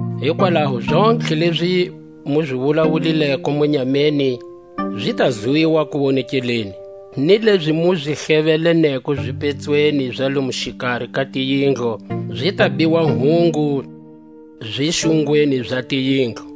Hikwalaho zontlhe lezi mu zi wulawulileko munyameni zi ta zwiwa kuwonekeleni; ni lezi mu zi hlevele-neko zipetsweni za lomo xikari ka tiyindlu, zi ta biwa hungu zixungweni za tiyindlu.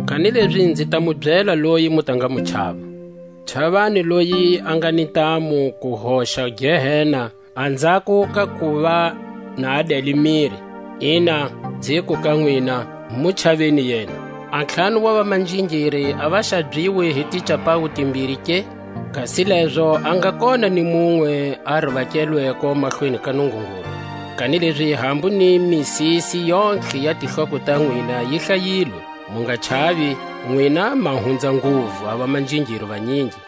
Kanilezi nzi ta mu byela loyi mu ta nga mu chava: Chavani loyi a nga ni ntamu ku hoxa Gehena anzhako ka kuva na a dele miri; ina, nziku ka nwina, mu chaveni yena. A ntlhanu wa vamanjingiri a va xabyiwi hi ticapawu timbiri ke? Kasi lezo a nga kona ni munwe a rivakelweko mahlweni ka Nungungulu. Kanilezi hambu ni misisi yontlhe ya tihloko ta nwina yi hlayilwe. Mu nga chavi, nwina ma va hunza nguvu a vamanjingiri vanyingi.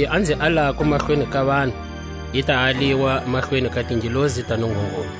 Kanilezi loyi a nzi alako mahlweni ka vanhu, i ta aliwa mahlweni ka tingelosi ta Nungungulu,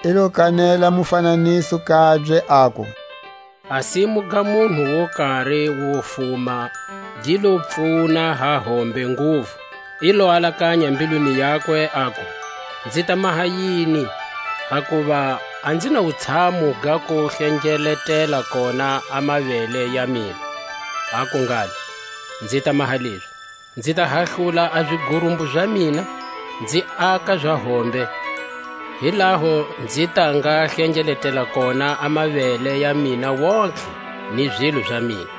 I lo kanela a mufananiso kabye, aku: A simu ga munhu wo kari wo fuma gi lo pfuna ha hombe nguvu; i lo alakanya mbilwini yakwe, aku: Nzi ta maha yini, hakuva a nzi na wutshamu ga ku hlengeletela kona a mavele ya mina? Aku ngalo: Nzi ta maha lezi: nzi ta hahlula a zigurumbu za mina, nzi aka za hombe; hi laho nzi ta nga hlengeletela kona a mavele ya mina wontihe ni zilo za mina.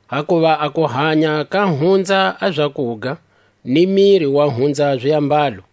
Hakuva a kuhanya ka hunza a zakuga, ni miri wa hunza ziambalo.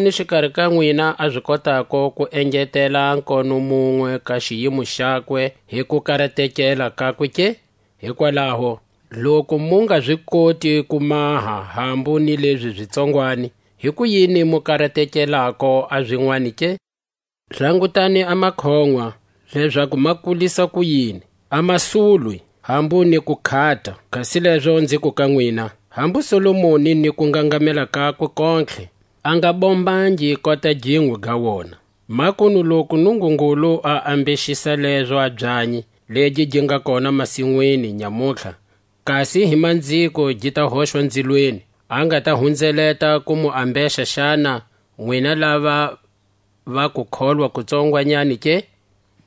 Himani xikari ka nwina a zi kotako ku engetela a nkono munwe ka xiyimo xakwe hi kukaratekela kakwe ke? Hikwalaho loku mu nga zi koti ku maha hambu ni lezi zi tsongwani, hikuyini mu karatekelako a zinwani ke? Langutani a makoʼnwa, lezaku ma kulisa kuyini: a ma swuli, hambu ni ku khata; kasi lezo nziku ka nwina: Hambu Solomoni hi kungangamela kakwe kontlhe a nga bombangi kota ginwe ga wona. Makunu loku Nungungulu a ambexisa lezo a byanyi, legi gi nga kona masinwini nyamutlha, kasi hi manziko gi ta hoxwa nzilweni; a nga ta hunzeleta ku mu ambexa xana, nwina lava va kukholwa ku tsongwanyani ke?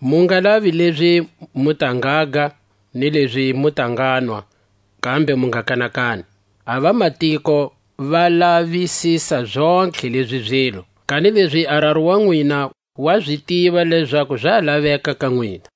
Mu nga lavi lezi mu ta ngaga, ni lezi mu ta nganwa, kambe mu nga kanakani. A vamatiko va lavisisa zontlhe lezi zilo, kanilezi a Raru wa nwina wa zi tiva lezaku za laveka ka nwina;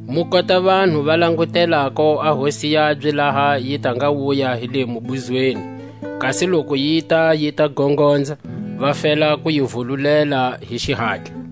mu kota vanhu va langutelako a hosi yabye laha yi ta nga wuya hi le mubuzweni; kasi loku yita yi ta gongonza, va fela ku yi vululela hi xihatla.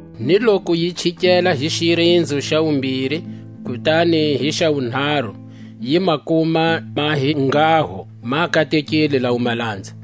Ni loku yi chikela hi xirinzo xa wumbiri, kutani hi xa wunharu, yi ma kuma ma hi nghaho, ma katekile lawo malanza.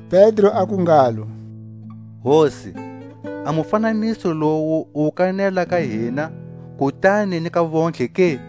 Pedro aku ngalo: Hosi, a mufananiso lowu u wu kanela ka hina, kutani ni ka vontlhe ke?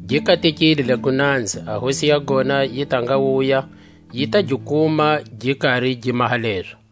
Gi katekile lego nanza, a hosi ya gona yi ta nga wuya yi ta gi kuma gi kari gi maha lezo.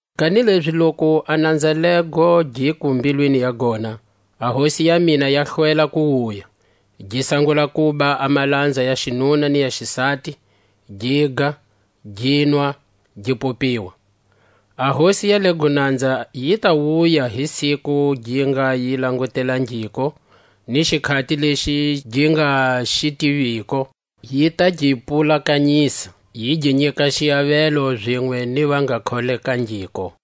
Kanilezi loku a nanza lego giku mbilwini ya gona: A hosi ya mina ya hlwela ku wuya; gi sangula kuba a malanza ya xinuna ni ya xisati, giga, ginwa, gi popiwa; a hosi ya lego nanza yi ta wuya hi siku gi nga yi langutelangiko, ni xikhati lexi gi nga xi tiviko, yi ta gi pulakanyisa, yi gi nyika xiavelo zinwe ni va nga kholekangiko.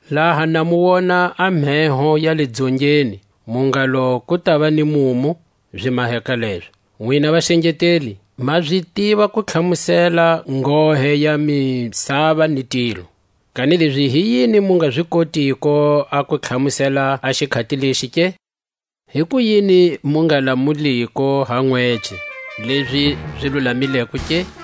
Laha na mu wona a mheho ya le Dzongeni, mu ngalo: Ku tava ni mumu; zi maheka lezo. Nwina vaxengeteli, ma zi tiva ku tlhamusela nghohe ya misava ni tilo; kanilezi hi yini mu nga zi kotiko a ku tlhamusela a xikhati lexi ke? Hikuyini mu nga lamuliko ha nwece lezi zi lulamileko ke?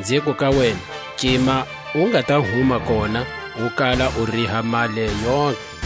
Nziku ka wena, Cima u nga ta huma kona, u kala u riha mali yontlhe.